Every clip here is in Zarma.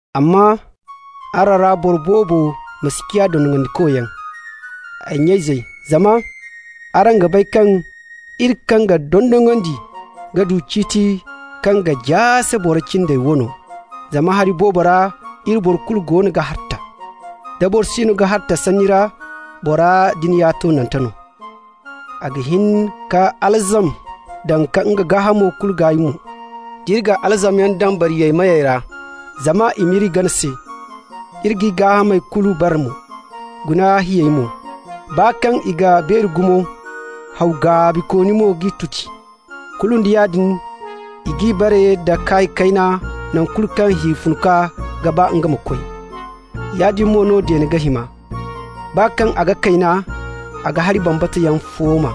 Amma araŋ ra boro boobo ma si ciya dondonandikoyaŋ, ay nya-izey, zama araŋ ga bay kaŋ iri kaŋ ga dondonandi ga du ciiti kaŋ ga jaase boro cindey wano. Zama hari boobo ra iri boro kulu goono ga harta. Da boro siino ga harta sanni ra, bora din ya toonante no. A ga hin ka alzam daŋ ka nga gaahamo kulu gaay mo. D'iri ga alzamyaŋ daŋ bariyey meyey ra zama i m'iri gana se, iri g'i gaahamey kulu bare mo. Guna hiyey mo. Baa kaŋ i ga beeri gumo, haw gaabikooni mo g'i tuti, kulu nda yaadin i g'i bare nda kaay kayna nangu kulu kaŋ hi funkwa ga ba nga ma koy. Yaadin mo no deene ga hima. Baa kaŋ a ga kayna, a ga hari bambata yaŋ fooma.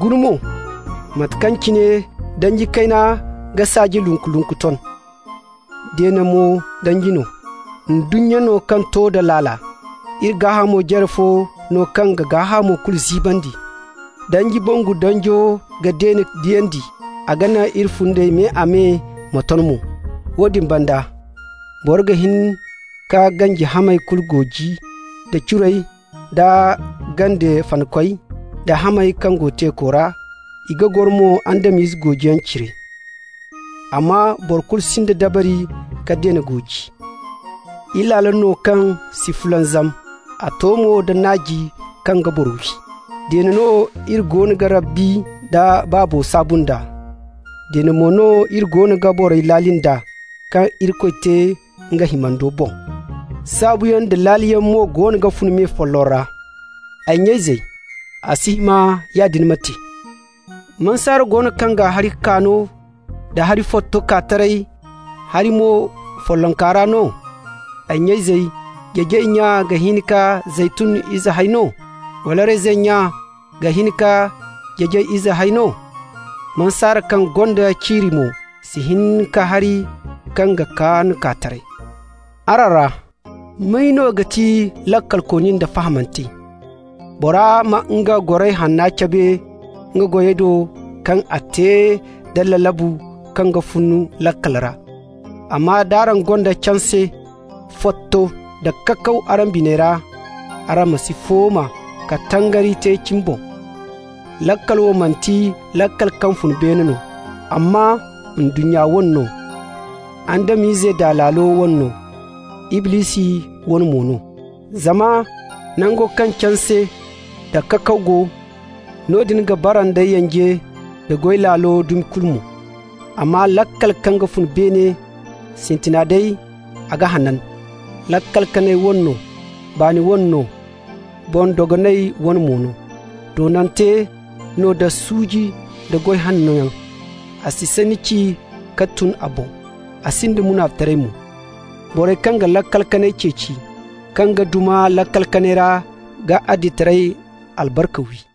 Guna mo mate kaŋ cine danji kayna ga saaji lunku-lunku ton. Deene mo danji no. Ndunnya no kaŋ to da laala. Iri gaahamo jare fo no kaŋ ga gaahamo kulu ziibandi. Danji bangu danjo ga deene diyandi, a ga naŋ iri fundey me-a-me ma ton mo. Woodin banda, boro ga hin ka ganji hamey kulu gooji, da curey da gande fanakey da hamey kaŋ go teeko ra, i goro mo Adam-izey goojiyaŋ cire. Amma boro kulu sinda dabari ka deene gooji. Ilaalo no kaŋ si fulanzam, a to mo da naaji kaŋ ga boro wi. Deene no iri goono ga Rabbi nda Baabo saabu nd'a. Deene mo no iri goono ga borey laali nd'a, kaŋ Irikoy te nga himando boŋ. Saabuyaŋ da laaliyaŋ mo goono ga fun me folloŋ ra. Ay nya-izey, a si hima yaadin ma te. Mansaare go no kaŋ ga hari kaano da hari fotto kaa taray hari mo follonku ra no?. Ay nya-izey, jeejay nya ga hin ka zeytun ize hay no? Wala reyzin nya ga hin ka jeejay ize hay no? Mansaare kaŋ gonda ciiri mo si hin ka hari kaŋ ga kaan kaa taray. Araŋ ra may no ga ti laakalkooni nda fahamante? Bora ma nga goray hanna cabe nga goyey do kaŋ a ga te da lalabu kaŋ ga fun laakal ra. Amma d'araŋ gonda canse fotto da kakaw araŋ biney ra, araŋ ma si fooma ka tangari te cimi boŋ. Laakal wo manti laakal kaŋ fun beene no, amma ndunnya wane no, Adam-ize daa laala wane no, Iblisi wane mo no. Zama nango kaŋ canse nda kakaw go, noodin ga bara nda yanje nda goy laalo dumi kulu mo. Amma laakal kaŋ ga fun beene, sintina day a ga hanan, laakal kanay wane no, baani wane no, boŋ-dogonay wane mo no. Toonante no da suuji nda goy hannoyaŋ. A si sanni ci ka tun a boŋ, a sinda munaficitaray mo. Borey kaŋ ga laakal kanay ceeci, kaŋ ga duma laakal kanay ra ga adilitaray albarka wi.